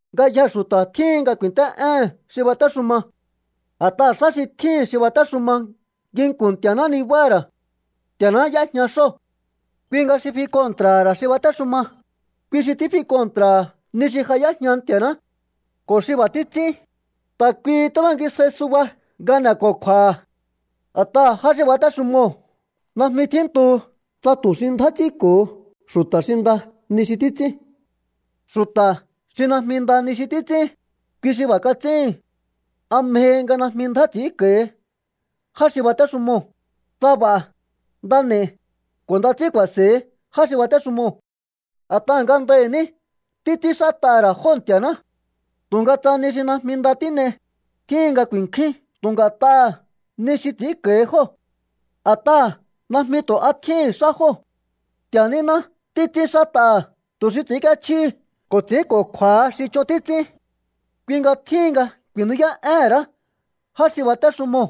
Ngayjee̱ xu̱ta̱ tjíhin nga ku̱i̱nt'é'éhe̱n xi batéxuma. A̱t'aha̱ xá xi tjíhi̱n xi batéxuma nginku̱n Nti̱a̱ná nibáha̱ ra̱. Nti̱a̱ná y'éjña xóo̱. Kui nga xi fi kontra̱ha̱ ra̱ xi batéxuma, kui xi tífi kontra̱ha̱ ni xi ja y'éjña Nti̱a̱ná. Ko̱ xi b'a̱ títs'ín, ta̱ kuihi tíbangisjai suba nga n'e̱ko̱kju̱a̱ha̱. A̱t'aha̱ já xi batéxumoo̱ najmi tjíntu tsa tu̱ xi ndjá ts'ínko̱ho xu̱ta̱ xi nda ni xi títs'ín. Xu̱ta̱ xi najmi nda ni xi títs'ín, kui xi b'a̱ kats'íhi̱n. ¿A mjehi nga najmi ndjá ts'i̱ínko̱hi já xi batéxumoo̱? Tsa b'a̱, nda n'e̱i, ko̱ nda ts'ín ku̱a̱se̱hi já xi batéxumoo̱. A̱t'aha̱ ngandahi̱ ní títs'ínxát'aha̱ ra̱ jóo̱ Nti̱a̱ná. Tu̱nga tsa ni xi najmi nda tín'ei, tjíhin nga ku̱i̱nkjúín tu̱ nga̱t'aha̱ ni xi ts'i̱ínko̱hi jóo̱. A̱t'aha̱ najmi tu̱ a tjíhi̱n xá jóo̱. Nti̱a̱ níná títs'ínxát'aha̱ tu̱ xi ts'i̱ínk'íéchjíhi ko̱ ts'i̱ínko̱kju̱a̱ha xi ch'on títs'ín. Kui nga tjíhin nga ku̱i̱nú'yá'éhe̱n ra̱á já xi batéxumoo̱,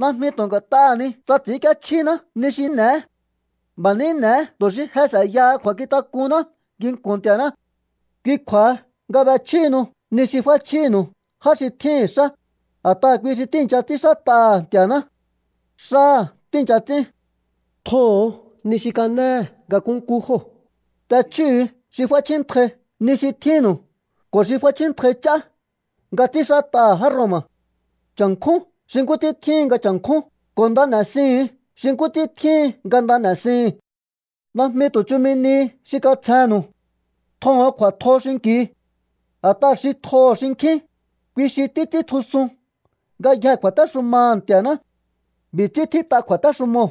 najmi tu̱ nga̱t'aha̱ ni tsa ts'i̱ínk'íéchjíná ni xi n'e̱é. B'a̱ ní n'e̱é tu̱ xi je s'e̱yaha kju̱a̱nkjintak'unná nginku̱n Nti̱a̱ná. Kui kju̱a̱ha nga b'echjíhinu ni xi f'áchjínu̱u já xi tjíhi̱n xá, a̱t'aha̱ kui xi tíi̱ncha ts'ínxát'aha̱ Nti̱a̱ná. Xáha̱ tíi̱ncha ts'ín. Tjoho̱on ni xi kanéhe̱ nga nkúnkú jóo̱. T'echjíhu̱u xi f'áchjíntjai ni xi tjínnu̱u ko̱ xi f'áchjíntjai ch'á nga ts'ínxát'aha̱ já Roma̱. Cha̱nkjún xi nkú ts'ín tjíhin nga cha̱nkjún, ko̱ nda n'e̱siuhu̱un xi nkú ts'ín tjíhin nga nda n'e̱sihi̱n. Najmi tu̱ chumi nihi xi katsjennu̱u. Tjoho̱on kju̱a̱tjo xinki̱u. A̱t'aha̱ xi tjoho̱ xinkjín, kui xi títs'íntjusun ngayjee̱ kju̱a̱téxumaha̱ Nti̱a̱ná. B'i̱ ts'ín tjít'a kju̱a̱téxumoo̱: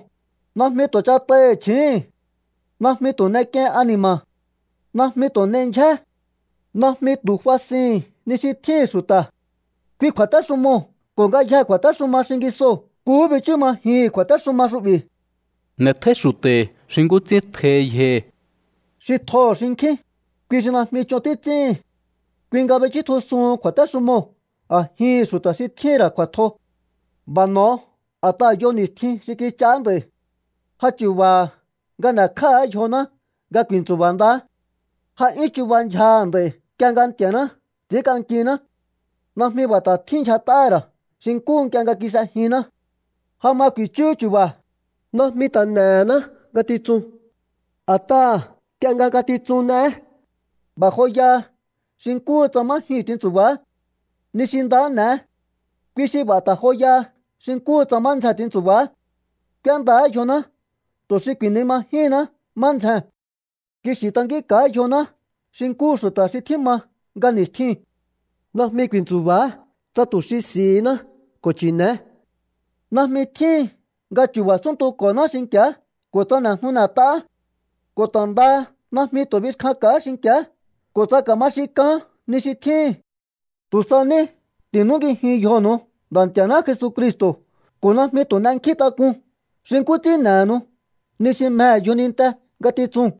“Najmi tu̱ ch'at'aihi̱ chji̱íhi̱n. Najmi tu̱ n'ek'iein ani̱ma̱. Najmi tu̱ n'ei ndyjé. Najmi tu̱ fasihi̱n ni xi tjíhi̱n xu̱ta̱.” Kui kju̱a̱téxumoo̱ ko̱ ngayjee̱ kju̱a̱téxuma xingisoo̱ nkuhú bichú majihi̱n kju̱a̱téxuma xu'bi̱: “N'e̱tjóí xu̱ta̱hi̱ xi nkú ts'ín tjohi yjohi̱.” Xi tjoho̱ xinkjín, kui xi najmi ch'on títs'íhi̱n. Kui nga bichútjusuhun kju̱a̱téxumoo̱ a̱jihi̱n xu̱ta̱ xi tjíhi̱n ra̱ kju̱a̱tjo. B'a̱ n'o̱o a̱t'aha̱ yo ni̱stjin xi kich'aá nd'a̱i̱. Ja chu̱ba̱ha̱ nga n'e̱kj'áha̱á yjoná nga ku̱i̱ntsu̱ba̱ ndaá. Ja 'yún chuba ndyjaha̱ nd'a̱i̱ nk'ie nga Nti̱a̱ná ts'i̱ínk'ankiná. Najmi b'a̱ ta̱ tjín ndyjaha̱ ra̱ xi nkúhu nk'ie nga kis'ejinná. Ja ma ku̱i̱chúhú chu̱ba̱. Najmi ta̱ n'ehená ngatitsun, a̱taha̱ nk'ie nga ngatitsun n'eé, b'a̱ joyaha xi nkúhu tsa má jyuu̱n tintsu̱ba̱á. Ni xi nda n'e̱é. Kui xi b'a̱ ta̱ joyaha xi nkúhu tsa má ndzjen tintsu̱ba̱á. K'úéndaá yjoná tu̱ xi ku̱i̱nimajíhinná má ndzjee̱n. Kixi̱ tankínka̱á yjoná xi nkúhu xu̱ta̱ xi tjíma nga ni̱stjiu̱n. Najmi ku̱i̱ntsu̱ba̱á tsa tu̱ xi s'i̱hiná ko̱ chi̱ne̱é. Najmi tjíhin nga chu̱ba̱ súntuko̱náá xinki̱á ko̱ tsa n'e̱jnu n'e̱t'aá. Ko̱ ta̱ ndaha najmi tu̱ bixkjanka̱á xinki̱á ko̱ tsa ka̱ma xin k'aán ni xi tjíhi̱n. Tu̱ sa ní ti̱núngijiun yjonu̱u Nda̱ Nti̱a̱ná Jesucristo̱ ko̱ najmi tu̱ n'enkjíntak'un xi nkú ts'ín n'e̱henu ni xi mjehe̱ yjoninte ngatitsuu̱n.